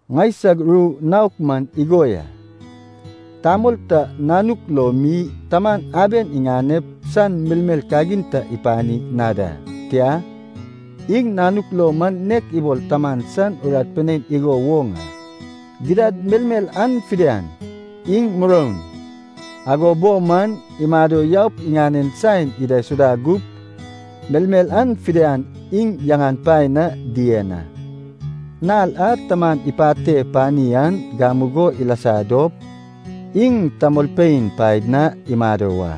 Ŋaisag ru naok man igo ya. Tamol ta nanuk lo mi taman aben iŋanep san melmel kagin ta ipani na da. Tia, iŋ nanuk lo man nek ibol taman san urat pinein igo woŋ a. Gidad melmel an fidian iŋ muroun, ago bo man imado yaup iŋanen saen idaisuda gup, melmel an fidian iŋ yaŋan paen na dien a. Nal a taman ipate pani an gamugo ilasa dop, iŋ tamolpein paed na imado wa,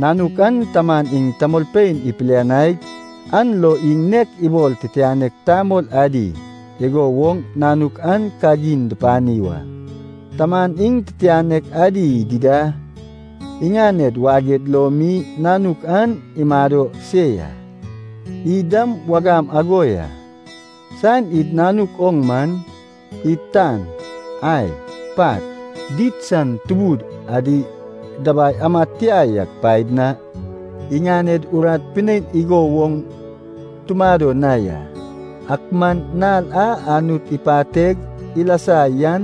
nanuk an taman iŋ tamolpein ipilianaig an lo iŋ nek ibol titianek tamol adi igo woŋ nanuk an kagin dupani wa. Taman iŋ titianek adi dida iŋaned waged lo mi nanuk an imado se ya. Id dam wagam ago ya. Saen id nanuk oŋ man, id tan, ai, pat, did san tubud adi dabai amad tia yak paed na iŋaned urat pinein igo woŋ tumado na ya. Ak man nal a Anut ipateg ilasa yan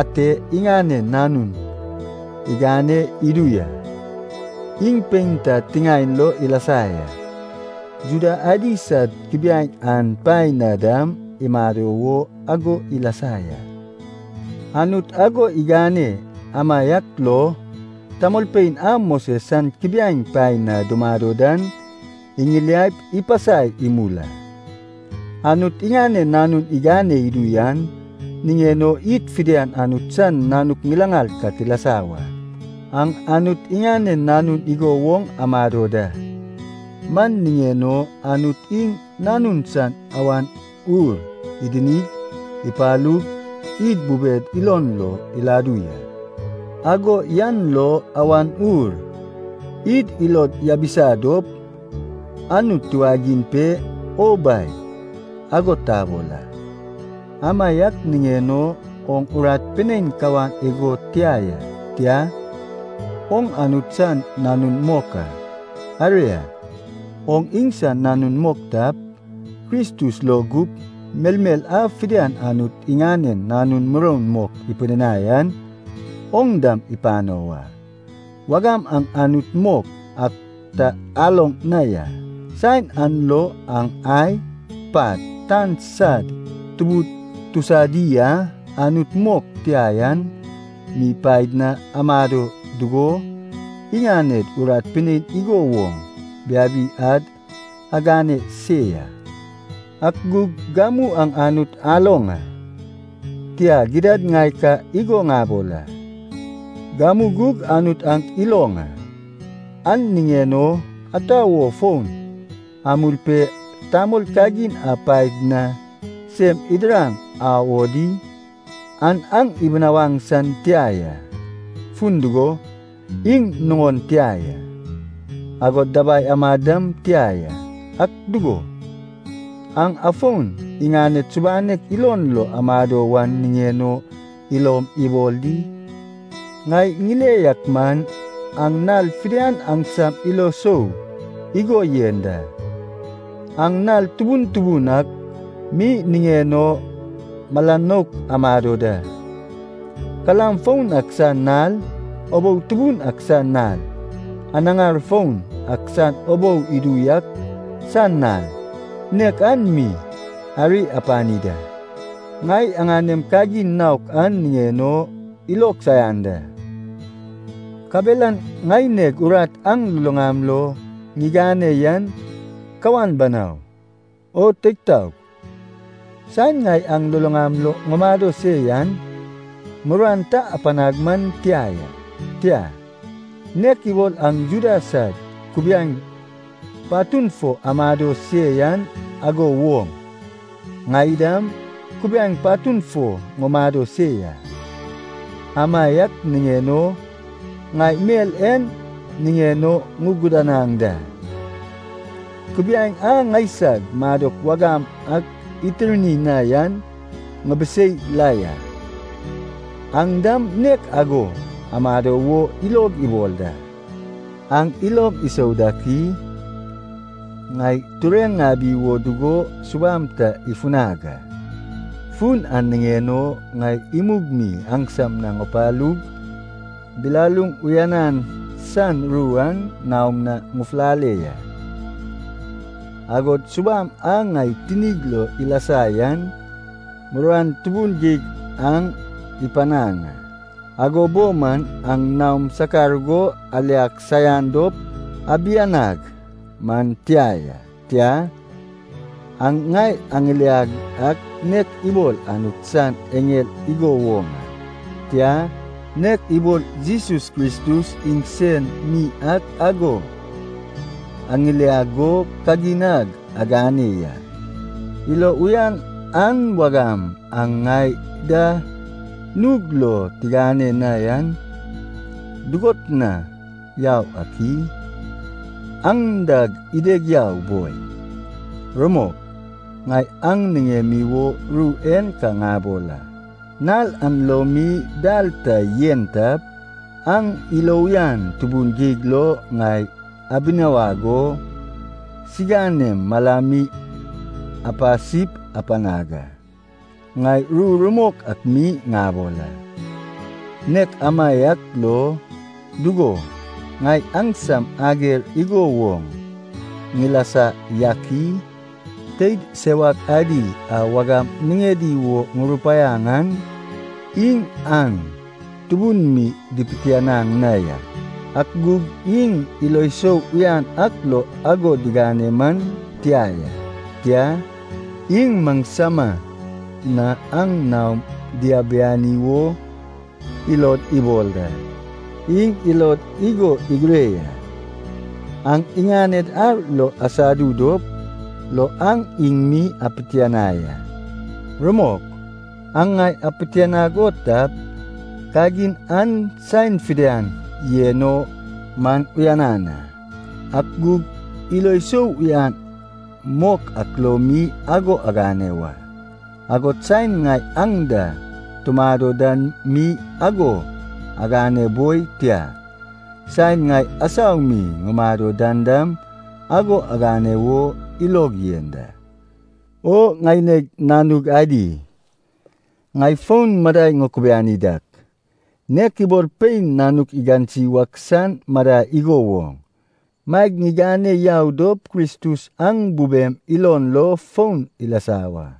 ate iŋanen Nanun igane idu ya. Iŋ pein ta tiŋaen lo ilasa ya, Juda adi sad kubiaeŋ an paen na dam imado wo ago ilasa ya. Anut ago igane amaiak lo tamolpein a Moses san kubiaeŋ paen na dumado dan iŋiliaip ipasai imul a. Anut iŋanen Nanun igane idu yan niŋen o id fidian Anut san nanuk ŋilaŋal ka tilasa wa. Aŋ Anut iŋanen nanun igo woŋ amado da. Man niŋen o Anut iŋ Nanun san Awan Ur idinig ipalug, id bubed ilon lo iladu ya. Ago yan lo Awan Ur id ilod yabisa dop, Anut tiwagiŋ pe, “O Bai,” ago tabol a. Amaiak niŋen o oŋ urat pinein kawan igo tia ya, tia, oŋ Anut san nanun mok a. Aria, oŋ iŋsan nanun mok tap, Kristus lo gup melmel a fidian Anut iŋanen nanun muroun mok ipidinai an, oŋ dam ipano wa. Wagam aŋ Anut mok ak ta aloŋ na ya, saen an lo aŋ ai, pat, tan sad tubud tusadi a anut mok tia yan mi paed na amado dugo, iŋaned urat pinein igo woŋ biabi ad agane se ya. Ak gug gamu aŋ Anut aloŋ a, tia gidad ŋai ka igo ŋabol a, gamu gug Anut aŋ iloŋ a. An niŋen o ata wo fon amul pe tamol kagin an paed na sem idiraŋ au o di? An aŋ dibinawaŋ san tia ya, fun dugo, iŋ nuŋon tia ya, agod dabai amad dam tia ya. Ak dugo, aŋ afon iŋaned subanek ilon lo amado wan niŋen o ilom ibol di? Ŋai ŋile yak man, aŋ nal fidian aŋsam ilo sou igo yen da. Aŋ nal tubun tubun ak mi niŋen o mala nouk amado da. Kalam foun ak san nal, ubou tubun ak san nal, anaŋar foun ak san ubou idu yak san nal, nek an mi ari apani da. Ŋai aŋanem kagin naok an niŋen o ilog saian da, kabelan ŋaineg urat aŋ luluŋam lo ŋigane yan kawan banau. O teig taog, saen ŋai aŋ luluŋam lo ŋumado se yan, muruan ta apanag man tia ya. Tia, nek ibol aŋ Juda sad kubiaeŋ patun fo amado se yan ago woŋ, ŋai dam, kubiaeŋ patun fo ŋumado se ya. Amaiak niŋen o, ŋai mel en niŋen o ŋuguduanaŋ da. Kubiaeŋ a ŋaisag madok wagam ak itirni na yan ŋibisei la ya, aŋ dam nek ago amado wo ilog ibol da. Aŋ ilom isou dak i? Ŋai tureŋ ŋabi wo dugo subam ta ifunag a, fun an niŋen o ŋai imug mi aŋsam na ŋupalug bilaluŋ uyanan san ru an naom na ŋufulale ya. Agod subam a ŋai tinig lo ilasa yan muruan tubun geig aŋ ipanaŋ a. Ago bo man aŋ naom sakar go aliag saian dop abianag man tia ya. Tia, aŋ ŋai aŋiliag ak nek ibol Anut san eŋel igo woŋ a, tia, nek ibol Jesus Kristus iŋsen mi ak ago aŋiliag go kagin ag agane ya. Ilo uyan an wagam aŋ ŋai da nug lo tigane na yan dugot na yau ak i? An dag ideg yau boi. Rumok, ŋai aŋ niŋemi wo ru en ka ŋabol a. Nal an lo mi dal ta yen tap, aŋ ilo uyan tubun geig lo ŋai abinawag o siŋanem malami apasip apanag a. Ŋai ru rumok ak mi ŋabol a. Nek amaiak lo, dugo, ŋai aŋsam ager igo woŋ ŋilasa yak i? Teid sewak adi a wagam niŋedi wo ŋurupaiaŋ an iŋ aŋ tubun mi dipitianaŋ na ya. Ak gug iŋ ilo sou uyan ak lo ago digane man tia ya. Tia, iŋ maŋsama na aŋ naom diabiani wo ilod ibol da. Iŋ ilod igo igire ya, aŋ iŋaned ar lo asadu dop lo aŋ iŋ mi apitianai a. Rumok, aŋ ŋai apitianag o tap, kagin an saen fidian yen o man uyanan a, ak gug ilo sou uyan mok ak lo mi ago agane wa. Agod saen ŋai aŋ da tumado dan mi ago agane boi tia, saen ŋai asau mi ŋumado dan dam ago agane wo ilog yen da. O ŋaineg nanug adi, ŋai fon madai ŋukubiani dak, nek ibol pein nanuk igansi wak san madai igo woŋ, maeg ŋigane yau dop Kristus aŋ bubem ilon lo fon ilasa wa.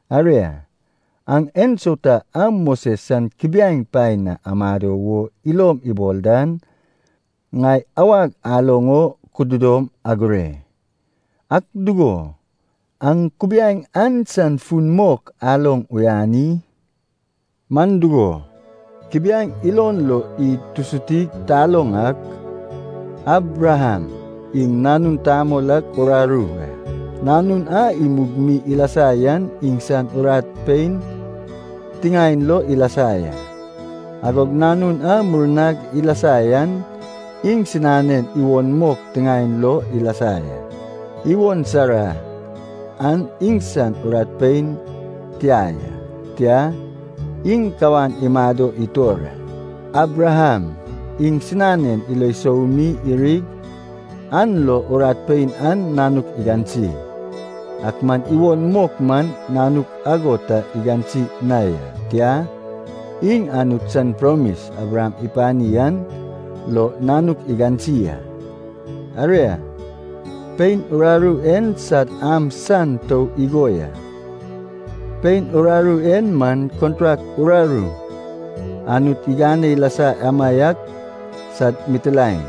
Aria, aŋ ensauta a Moses san kubiaeŋ paen na amado wo ilom ibol dan, ŋai awag aloŋ o kududom agure. Ak dugo, aŋ kubiaeŋ an san fun mok aloŋ uyan i? Man dugo, kubiaeŋ ilon lo id tusutig taloŋ ak, Abraham iŋ nanun tamol ak uraru a. Nanun a imug mi ilasa yan iŋsan urat pein tiŋaen lo ilasa ya, agog nanun a murnag ilasa yan iŋsinanen iwon mok tiŋaen lo ilasa ya. Iwon Sara an iŋsan urat pein tia ya, tia, iŋ kawan imado itor a. Abraham iŋsinanen ilo sou mi irig an lo urat pein an nanuk igansi. Ak man iwon mok man nanuk ago ta igansi na ya. Tia, iŋ Anut san promis Abraham ipani an lo nanuk igansi a. Aria, pein uraru en sad am san tou igo ya. Pein uraru en man kontrak uraru Anut igane ilasa amaiak sad mitilaen.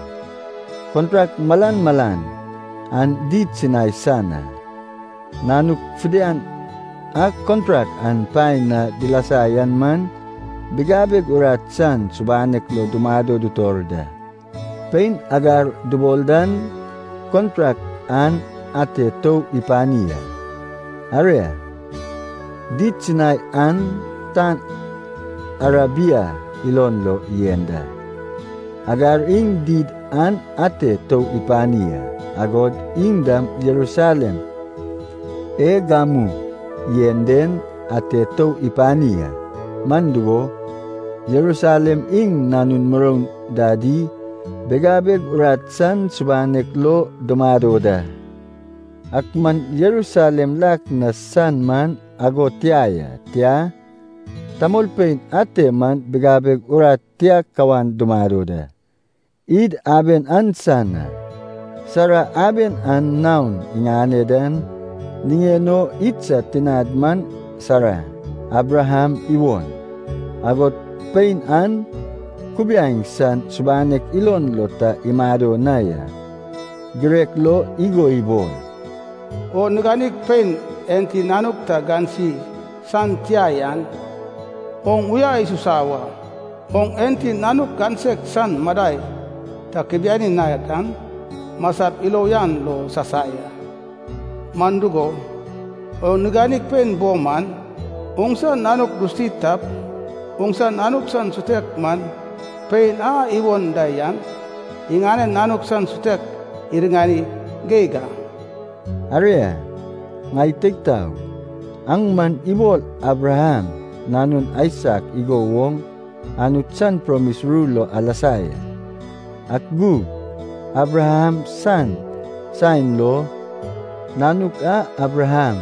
Kontrak malan malan an did Sinai san a. Nanuk fidian a kontrak an paen na dilasa yan man bigabeg urat san subanek lo dumado dutor da. Pein Hagar dubol dan kontrak an ate tou ipani a. Aria, did Sinai an tan Arabia ilon lo yen da. Hagar iŋ did an ate tou ipani a, agod iŋ dam Jerusalem e gamu yen den ate tou ipani a. Man dugo, Jerusalem iŋ nanun muroun dadi bigabeg urat san subanek lo dumado da. Ak man Jerusalem lak na san man ago tia ya. Tia, tamolpein ate man bigabeg urat tia kawan dumado da. Id aben an san a. Sara aben an naon iŋane dan niŋen o idsad tinad man Sara, Abraham iwon. Agod pein an kubiaeŋ san subanek ilon lo ta imado na ya. Girek lo igo ibol, “O niganig pein enti nanuk ta gansi san tia yan, oŋ uya isusa wa. Oŋ enti nanuk gansek san madai ta kubiani na dan, masap ilo uyan lo sasai a. Man dugo, oŋ niganig pein bo man, oŋsa nanuk dusuti tap, oŋsa nanuk san sutek man, pein a iwon da yan iŋanen nanuk san sutek iriŋani geig a.” Aria, ŋai teig taog, aŋ man ibol Abraham nanun Aisak igo woŋ Anut san promis ru lo alasa ya. Ak gug Abraham san saen lo, nanuk a Abraham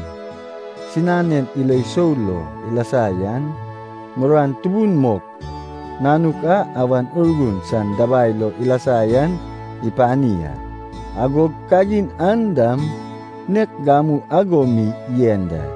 sinanen ilo sou lo ilasa yan, muruan tubun mok nanuk a Awan Urgun san dabai lo ilasa yan ipani a. Agog kagin an dam nek gamu ago mi yen da.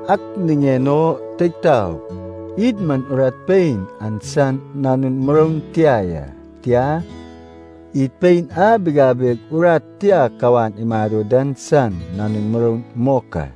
Ak niŋen o teig taog, id man urat pein an san nanun muroun tia ya, tia, id pein a bigabeg urat tia kawan imado dan san nanun muroun mok a.